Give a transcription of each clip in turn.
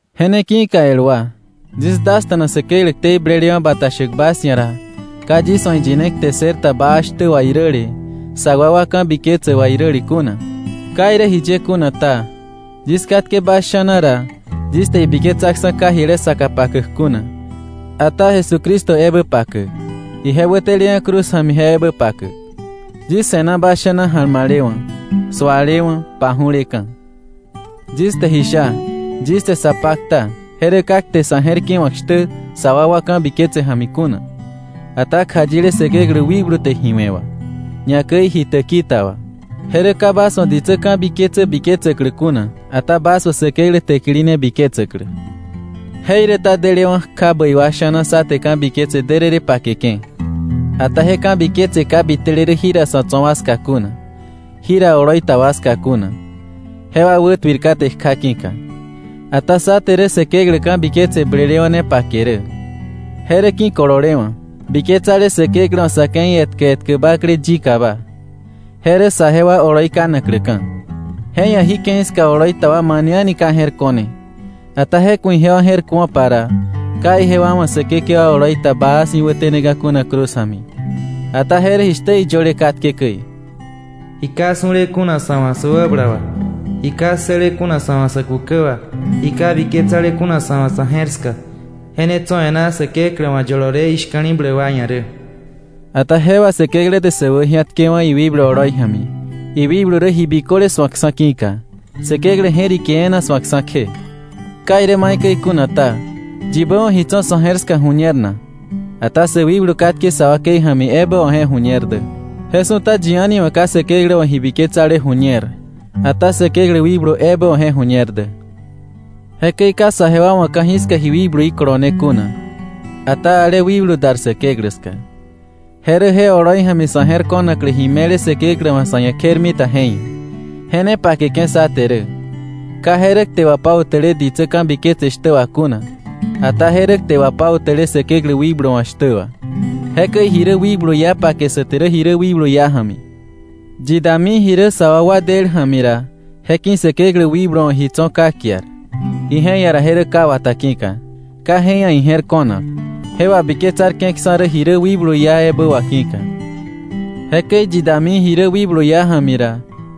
Je ne ki̱ka el wa, yis dasta̱na Säkeklä ktei blelewa̱ bata shäk bas ia̱ ra, ka yis wa̱ iyine kte ssërta baa shtä wà iräle, sa wakwa ka̱biketsä wà iräle kuna. Ka irä jiye kuna ta, yis katke bas sha̱na ra, yis te ibiketsaksa̱ ka jile saka pakäk kuna, ata Jesucristo ebä pakäk, ije wäteleka̱ cruz ja̱mi je ebä pakäk. Yis se̱na bas sha̱na ja̱lma̱lewa̱, sualewa̱, paju̱leka̱. Yis te ji sha, yis te sa pakta, je rä ka kte sa̱ je̱r ki̱wa̱k shtä sa wakwa ka̱biketse ja̱mi kuna, ata kjayile Säkeklä wikblu te ji we̱ wà, ñakäi ji täki ta wà. Je rä ka bas wa̱ ditsä ka̱biketsä biketsäklä kuna, ata bas wa̱ Säkeklä täkili ne biketsäklä. Jeiräta delewa̱ kja bäi wa sha̱na sá te ka̱biketse därërë pakeke̱, ata je ka̱biketse ka bitele rä jira tso̱ wa ska kuna, jira oloi ta wa ska kuna, jewa wätuir kate kja ki̱ka. Ata sá te rä Säkeklä ka̱biketse blelewa̱ ne pake rä. Je rä ki̱kolewa̱, biketsale Säkeklä wa̱ sa̱ ke̱i etkä etkä bakle yikaba, je rä saje wa oloi kanakläka̱. Je ia̱ jí ke̱i ska oloi ta wa mane a̱ni ka je̱r ko̱ne, ata je ku̱ ijewa je̱r kuo̱pa ra, ka ijewa wa̱ Säkekewa oloi ta baa si̱ wäteneka̱ kuna cruz ja̱mi. Ata je rä jishtä iyöle katke käi: “Ji ka su̱le kuna sa̱ wa̱ sä wäbala wà, ji ka ssële kuna sa̱ wa̱ sä kukä wà, ji ka biketsale kuna sa̱ wa̱ sa̱ je̱r ska, je ne tso̱ e̱ná Säkeklä wa̱ yolole ishka̱li̱bläk wa ia̱ rä.” Ata je wà Säkeklä te sä wäji̱atkewa̱ iwikblu oloi ja̱mi, iwikblu rä ji biköle su̱akksa̱ ki̱ka, Säkeklä je̱rike e̱e̱na su̱akksa̱ kje. Ka irä maikäi kuna ta, ¿yibä wa̱ ji tso̱ sa̱ je̱r ska ju̱ñer na? Ata sä wikblu katke sa wakei ja̱mi ebä wa̱ je ju̱ñer dä. Je su̱ta yi a̱ni wa̱ ka Säkeklä wa̱ ji biketsale ju̱ñer, ata Säkeklä wikblu ebä wa̱ je ju̱ñer dä. Jekäi ka saje wa wa̱ ka̱jiska ji wikbluí kolone kuna, ata ale wikblu dar Säkeklä ska. Je rä je oloi ja̱mi sa̱ je̱r ko̱naklä ji me̱le Säkeklä wa̱ sa̱ ia̱ kjermita je ia̱. Je ne pakeke̱ sá te rä, ka je rä kte wapautäle ditsä ka̱biketse shtä wà kuna, ata je rä kte wapautäle Säkeklä wikblu wa̱ shtä wà. Jekäi ji rä wikblu iá pake sá te rä ji rä wikblu iá ja̱mi. Yi dami ji rä sä wakwa del ja̱mi ra, je ki̱ Säkeklä wikblu wa̱ ji tso̱ ka kiar, ije ia̱ ra je rä ka wata ki̱ka. Ka je ia̱ ije̱r ko̱nak, je wabiketsarke̱ksa̱ rä ji rä wikblu iá ebä wà ki̱ka. Jekäi yi dami ji rä wikblu iá ja̱mi ra,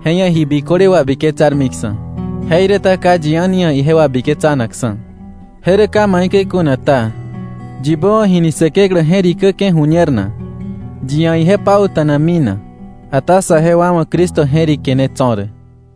je ia̱ ji biköle wabiketsarmiksa̱, jeiräta ka yi a̱ni ia̱ ije wabiketsanakksa̱. Je rä ka maikäi kuna ta, “¿Yibä wa̱ ji ni Säkeklä je̱rikäke̱ ju̱ñer na? ¿Yi ia̱ ije pauta̱nami na?” Ata saje wa wa̱ Cristo je̱rike ne tso̱ rä.